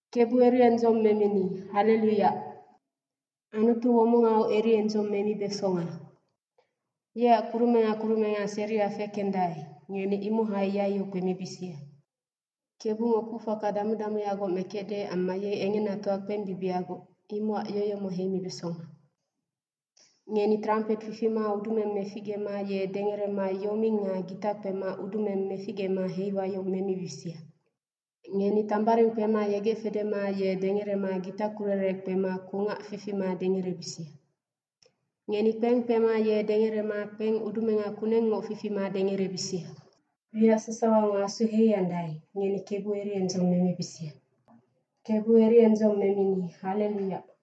Kebu eriendzong memini, hallelu Yac. Anutu womongau eriendzong memibesonga. Yeac kurumenga kurumenga seria fekendae, ngeni imohai yaiyo kpemibisia. Kebungo kucfaka damu damuyagoc mekecde amma ye engenatoa kpembibihagoc, imocac yoyomo heimibesonga. Ngeni trampet fifima udumeng meficgema ye dengerema yoming nga gita kpema udumeng meficgema heiwayong memibisia. Ngeni tambaring kpema yegec fedema ye dengerema gitakurere kpema kungac fifima dengerebisia. Ngeni kpeng kpema ye dengerema kpeng udumenga kunengngoc fifima dengerebisia. Wiac sasawango asu heiandae, ngeni Kebu eriendzong memibisia. Kebu eriendzong memini, hallelu Yac.